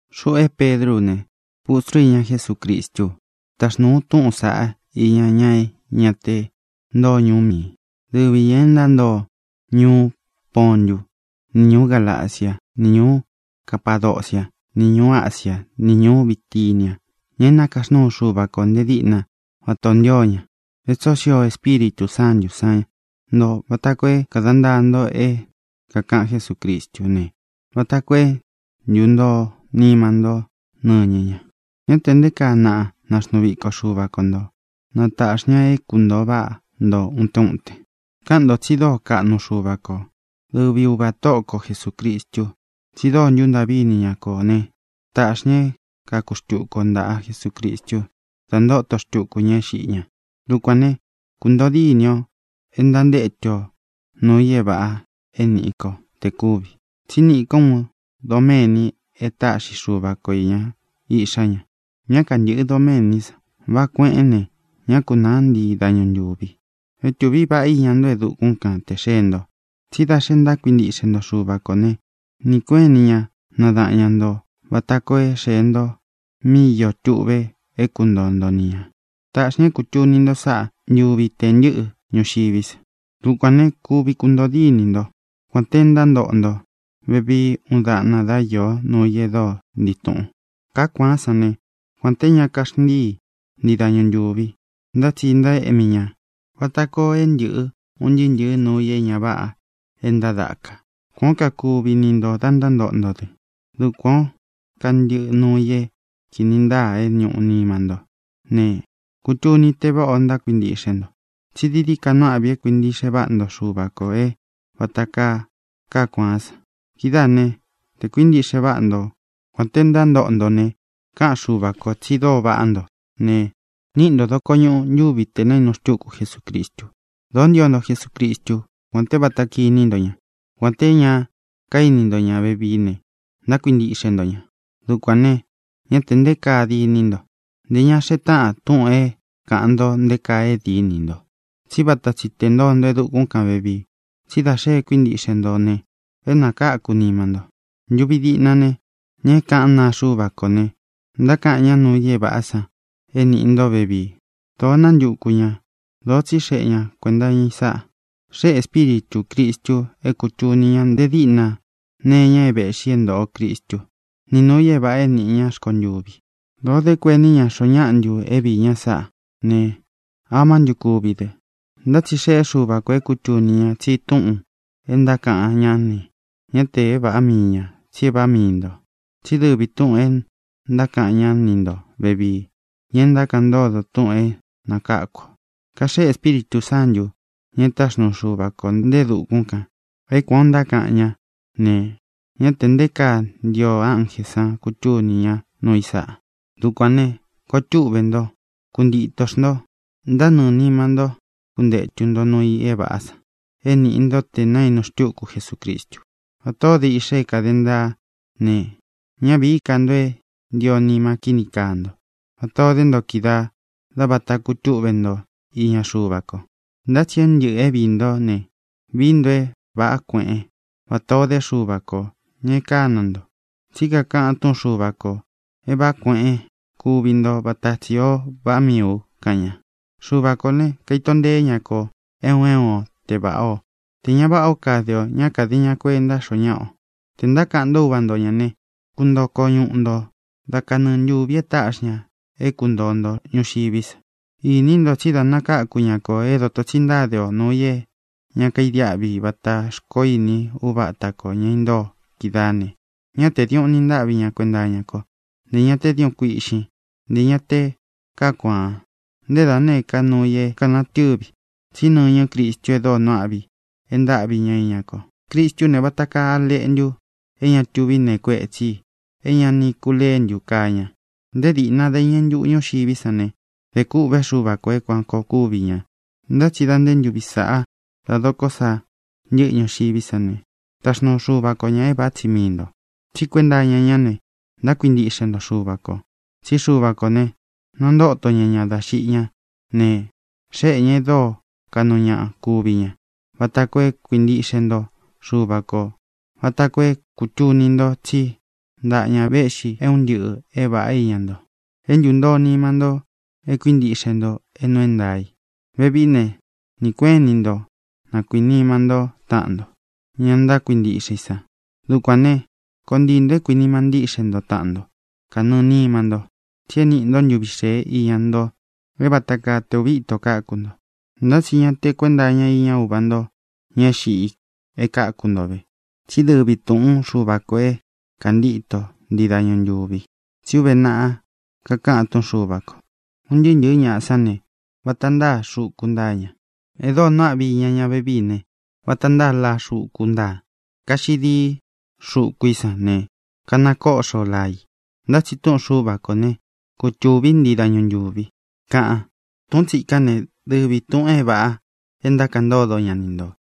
Xuꞌu é Pedrú u ne, pustru iña Jesúcristú u. Taxnūu u túꞌūn saꞌá iña ña é ña te ntóo ñuú mii ī, dɨvi ñā e ntántoo ñuú Pontú, ni ñūú Galaciá, ni ñūú Capadociá, ni ñūú Asiá, ni ñūú Bitinia, ña e nákaxnúu Xuva kō nte díꞌna vatā o ntío ña. E tsóo xio Espíritū Sántū san nto vata koo é kāda ntaa nto é kākaꞌan Jesúcristú ne, vata koo é ntūntoo nima ntó nɨñɨ ña. Ñá tē nté kaa na naxnuu viko Xuva ko ntō, na tāꞌxi ña é kuntōo váꞌa nto utén uten. Káꞌan ō tsi dóo kaꞌnu Xuva ko, dɨvi Uvā Tóꞌo ko Jesūcristu, tsi dóo ntúntāꞌví ini ña kō né, tāꞌxi ña é kaku xtuku o ntāꞌa Jesucristu da ntóto xtuku ña é xiꞌi ña. Dukuān né, kuntōo díni ō é ntantétu o nūu i é vāꞌa é nīꞌi ko te kúvi. Tsí niꞌi ko uun doméni é taꞌxi Xuva ko īña iꞌxá ña. Ñá kantɨ̄ꞌɨ doméní san. Váꞌā kueꞌén ne, ñá kunāá ntii dañu ntūvi. É tūví vāꞌá iña nto e dukún kan tē xee nto. Tsí da xe ntákuintiꞌxe nto Xuva kō ne, nɨɨ̄ kueꞌén ini ña nadaꞌan ña nto vata koo é xēe nto míꞌi iō tuꞌve é kuntoo nto ni ñā. Taꞌxi ña é kūtuni nto sáꞌa ntuvi tē ntɨ́ꞌɨ ñuxiví sa. Dukuān né, kuvi kuntōo díni nto, kuān te ntántoꞌo nto vevii uun daꞌna dá iō nuu i e dóo ntii tūꞌun. Kāá kuaán san ne, kuān té ña kaxntíi ntii dañu ntūvi, ntá tsi ntaéꞌmi ña vata koo é ntɨ̄ꞌɨ un ntɨɨ́ ntɨ̄ɨ́ nuu i é ña váꞌa e ntádāka. Kuān ó kakuvi ni ntō da ntántoꞌo nto dɨ. Dukuān ó kantɨꞌɨ nuu i é kīni ntáa é ñūꞌu nima ntó ne, kutuni te váꞌa o ntákuintiꞌxe nto. Tsi dii dií ka nuu áꞌvi i é kuīntiꞌxe váꞌa nto Xuva kō é vāta kaa kaá kuaán san. Kidáā né, tē kuíntiꞌxe váꞌa nto, kuān te ntántoꞌo nto ne, káꞌan Xuva kō tsi dóo vaꞌá nto ne, niꞌi nto dokoñuꞌu ntuvi tē naínu xtúku Jesucristu. Dōó ntio nto Jesucristú, kuān té vata kiní nto ña. Kuān té ña kaíni ntó ña vevií ne, ntákuintiꞌxe nto ña. Dukuān ne, ñá tē nté kaa diní nto. Ntē ña xee táꞌan túꞌūn é kāꞌan nto nté kaa e dínī nto, tsí vata tsi tē ntoo nto e dukún kān vevii. Tsí da xe e kuíntiꞌxe nto ne, é nakáku nima nto. Ntuvi diꞌna ne, ña é kaꞌán naa Xuva kó ne, ntákaꞌan ñá nuu i é vāꞌá san é nīꞌi nto vevii. Dōo nántuku ña, dōo tsíxeꞌe ña kuēnta iña i sáꞌā. Xéꞌe Ēspíritū Cristu é kūtuni ñá nte díꞌna nee iña é vēꞌxi é ntōꞌo Cristú, ni nūu i é vāꞌa é nīꞌi ñá rkontuvi. Dōo dé kuení ñā xoo náꞌa ntu é viī ña sáꞌā ne, amá ntu kuvi dɨ. Ntá tsi xeꞌé Xuva kō é kūtuni ña tsi túꞌūn e ntákaꞌan ñá ne, ñá tē é vāꞌá mii ñā, tsi é vāꞌá mii ntō. Tsí dɨvi tūꞌun e ntákaꞌan ñá ni ntō vevii, ña e ntákaꞌan ntódo túꞌūn é nakáku ō. Kaxéꞌe Ēspíritū Sántū, ña e táxnuu Xuva kō nte e dukún kān, é kuān o ntákaꞌan ñá ne, ñá tē nté kaa ntio ánjē sán kutuni ñá nuu i sáꞌā. Dukuān ne, koo túꞌve nto. Kuntitō xnto. Ntánɨɨ̄ nima ntó kuntētu nto nuu i é vāꞌá san é nīꞌi nto te naínu xtúku Jesucristu. Vatā ó de iꞌxa é kāde ntaa ne, ñá vīí ka nto é ntio nima kíni kaa nto, vata ō dé nto kídaā dá vata kutúꞌve nto iña Xuva ko. Ntá tsi é un ntɨꞌɨ̄ é viī ntó ne, vií nto é vāꞌá kueꞌen, vatā ó de Xuva kō, ña e kána nto. Tsí kakaꞌan túꞌun Xuva kō: “É vāꞌá kueꞌen kuvi nto, vata tsi ō vaꞌá miī u”, kaꞌan ña. Xuva kō ne, kaito nteé ña kō é un é un o te vāꞌá o, tē ña váꞌa o kade ō; ñá kāde ña kuenta xoo ñáꞌa ō. Tē ntákaꞌan nto Úva nto ñā ne, kuntoo koñuꞌu nto dá kanɨɨ ntūvi e táꞌxi ña é kuntōo nto ñuxiví sa. Ini nto tsí da nakáku ña kō é dōto tsi ntáde o nuu i é ña kaidiáꞌvi vatā xkoó ini uváta kō, ña intóo kídaā ne, ñá tē diuꞌun ni ntáꞌvi ña kuenta iña kó, ntē ña té diuꞌun kuiꞌxín, ntē ña te káa kuaan, nté da nēé ka nuu i é kanatɨ́vi. Tsí nɨñɨ́ Cristu e dóo nuu áꞌvi i e ntáꞌvi ña iña ko. Cristú ne, vata kaa a leꞌntu é ña tuví nee kuetsí i, é ña ni kuléntū, kaa ña. Nté dīꞌna dá iñɨ ntuꞌu ñuxiví san ne, dē kûꞌvé Xuva kō é kuān koo kuvi ña. Ntá tsi dā nté ntuvi sāꞌa dá dokó sa ntɨꞌɨ ñuxiví sa ne, taxnuu Xuva ko ñā é vāꞌá tsi mii ntō. Tsí kuenta iña ñá ne, ntákuintiꞌxe nto Xuva kō. Tsí Xuva kō ne, nantóto ña ña dá xiꞌi ñá ne, xéꞌe ñā e dóo kaꞌnu ñaꞌa kúvi ña, vata koo é kuintiꞌxe nto Xuva kō, vata koo é kūtuni nto tsí ntaꞌa ña véꞌxi é un ntɨꞌɨ̄ é vāꞌá iña nto. É ntūntoo nima ntó e kuíntiꞌxe nto é nuu é ntaā i. Vevií ne, nɨɨ̄ kueꞌén ini nto na kuīnima ntó taꞌan nto, ña ntákuintiꞌxe i san. Dukuān né, koo ntii ntō é kuīnima ntíꞌxe nto taꞌan nto kanɨɨ̄ nima nto. Tsi e níꞌi nto ntuví xēé iña nto é vata kaa te ūvi íto káku nto. Ntá tsi ña te kuenta iña uva nto ña é xiꞌi e káku nto ve, tsí dɨvi tūꞌún Xuva kō é kāntíto ntii dañu ntūvi. Tsí uve naꞌa kakaꞌan túꞌun Xuva kō: Un ntɨɨ́ ntɨ̄ɨ́ ñaꞌa sán ne, vata ntáa xuku ntáa ña. E dóo nuu áꞌvi i iña ña vevíi ne, vata ntáa laa xuku ntáa. Kaxiꞌi dií xuku i sán ne, kanakóꞌxo laa i, ntá tsi túꞌun Xuva kō ne, kutūví ntii dañu ntūvi, kaꞌan. Tūꞌún tsikán ne, dɨvi tūꞌun é vāꞌa e ntákaꞌan ntódo ña ni ntō.